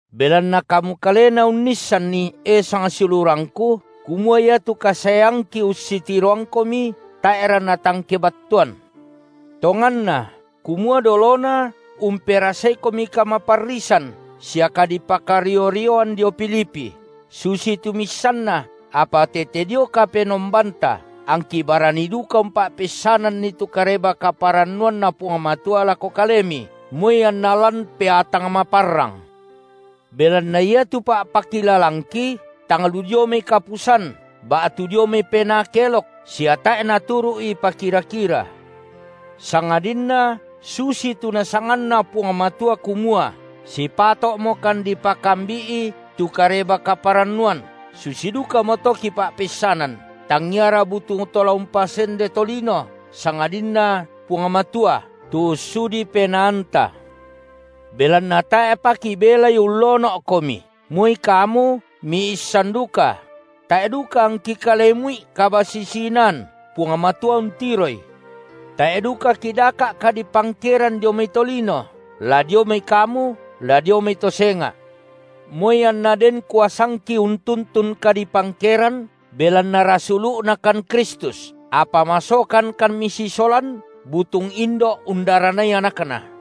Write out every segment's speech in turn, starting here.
Belanna kamu kalena unnissanni, e sangsiulurangku, kumua iatu kasaeangki ussitiroangkomi tae’ra natang kebattuan. Tonganna kumua dolona umperasaikan kamaparrisan sia kadipakario-rioan dio Filipi, susitu miissanna, apa tete dio Kapenombanta angki barani duka umpa’peissananni tu Kareba-kaparannuanNa Puang Matua lako kalemi, moi anna lan peatang maparrang. Belanna iatu pa’pakilalangki tang lu dio mai kapusan, ba’tu dio mai penaa kelok, sia tae’ naturu’i pakira-kira. Sangadinna susitu NasanganNa Puang Matua kumua sipato’mokan dipakambi’i tu Kareba-kaparannuan, susi dukamoto kipa’peissanan, tangiara butung to la umpasende tolino, sangadinna Puang Matua, tu ussudi penaanta. Belanna tae’pa kibelai ullono’komi, moi kamu miissan duka; tae’ duka angki kalemu’i kabasisi-inaan, Puang Matua untiroi! Tae’ duka kidaka’ kadipangkeran dio mai tolino, la dio mai kamu, la dio mai to senga’; moi anna den kuasangki untuntun kadipangkeran, belanna rasulu’Nakan Kristus, apa masokankan misisolan butung indo’ undaranai anakna.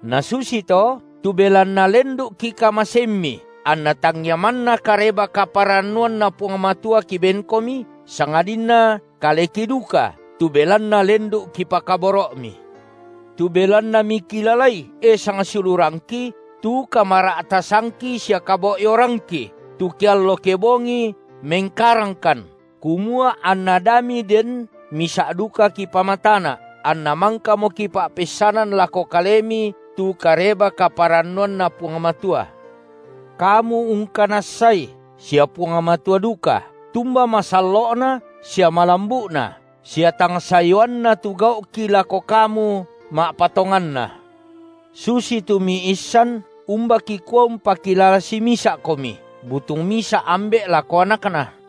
Na susito, tu belanna lendu’ kikamaseimmi, anna tangia manna Kareba-kaparannuanNa Puang Matua kibenkomi, sangadinna kaleki duka tu belanna lendu’ kipakaboro’mi. Tu belanna mikilalai, e sangsiulurangki, tu kamara’tasangki sia kabo’yorangki, tu keallo kebongi mengkarangkan, kumua anna da miden misa’ duka kipamatana’, anna mangkamo kipa’peissanan lako kalemi tu Kareba-kaparannuanNa Puang Matua. Kamu ungkanassai sia Puang Matua duka, tumba masallo’na sia malambu’na sia tang sayuanna tu gau’ki lako kamu ma’patonganna. Susitu miissan, umba kikua umpakilala simisa’komi, butung misa’ ambe’ lako anakna;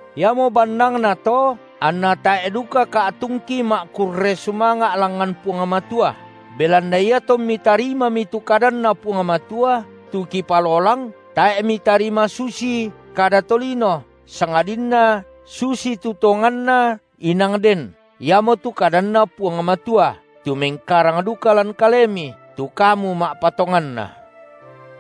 Iamo bannangnato anna tae’ duka ka’tungki ma’kurre sumanga’ langngan Puang Matua, belanna iatommi tarimami tu kadanNa Puang Matua, tu kipalolang, tae’ mitarima susii kada tolino, sangadinna susitu tonganna inang den, iamotu kadanNa Puang Matua, tu mengkarang duka lan kalemi, tu kamu ma’patonganna.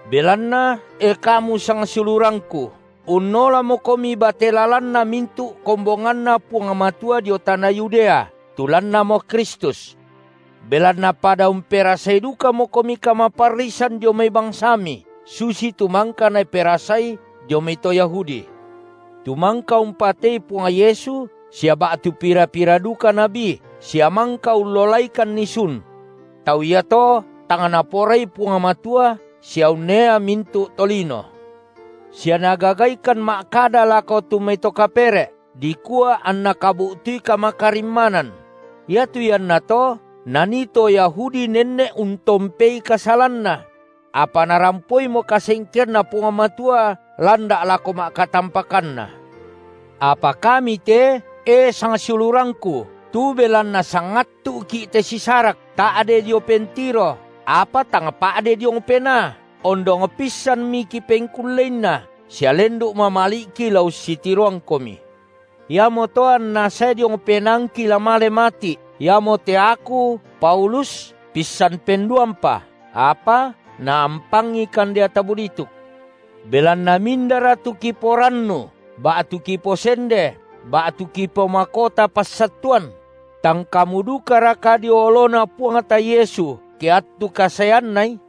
Belanna, e kamu sangsiulurangku, unnolamokomi bate lalanna mintu’ kombonganNa Puang Matua dio tana Yudea, tu lannamo Kristus. Belanna pada umperasai dukamokomi kamaparrisan dio mai bangsami, susitu mangka naperasai dio mai to Yahudi, tu mangka umpatei Puang Yesu sia ba’tu pira-pira duka nabi, sia mangka ullolaikanni sun. Tau iato tang Naporai Puang Matua sia unnea mintu’ tolino, sia nagagaikan ma’kada lako tu mai to kapere’, dikua anna kabu’tui kamakarimmanan; iatu iannato nanii to Yahudi nenne’ untompei kasalanna; apa narampoimo kasengkeanNa Puang Matua landa’ lako ma’katampakanna. Apa kami te, e sangsiulurangku, tu belanna sangattu’ki’ te sisarak, ta’de dio pentiro, apa tang pa’de diong penaa, ondong pissanmi kipengkulleinna sia lendu’ mamali’ki la ussitiroangkomi. Iamoto anna sae diong penaangki la male mati’, iamote aku Paulus pissan penduampa, apa naampangikan deata bulituk. Belanna mindara tu kiporannu ba’tu kiposende ba’tu kipomakota passattuan? Tang kamu dukaraka dio oloNa Puangta Yesu ke attu kasaeanNai?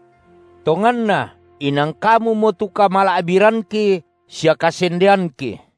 Tonganna inang kamumo tu kamala’biranki sia kasendeanki.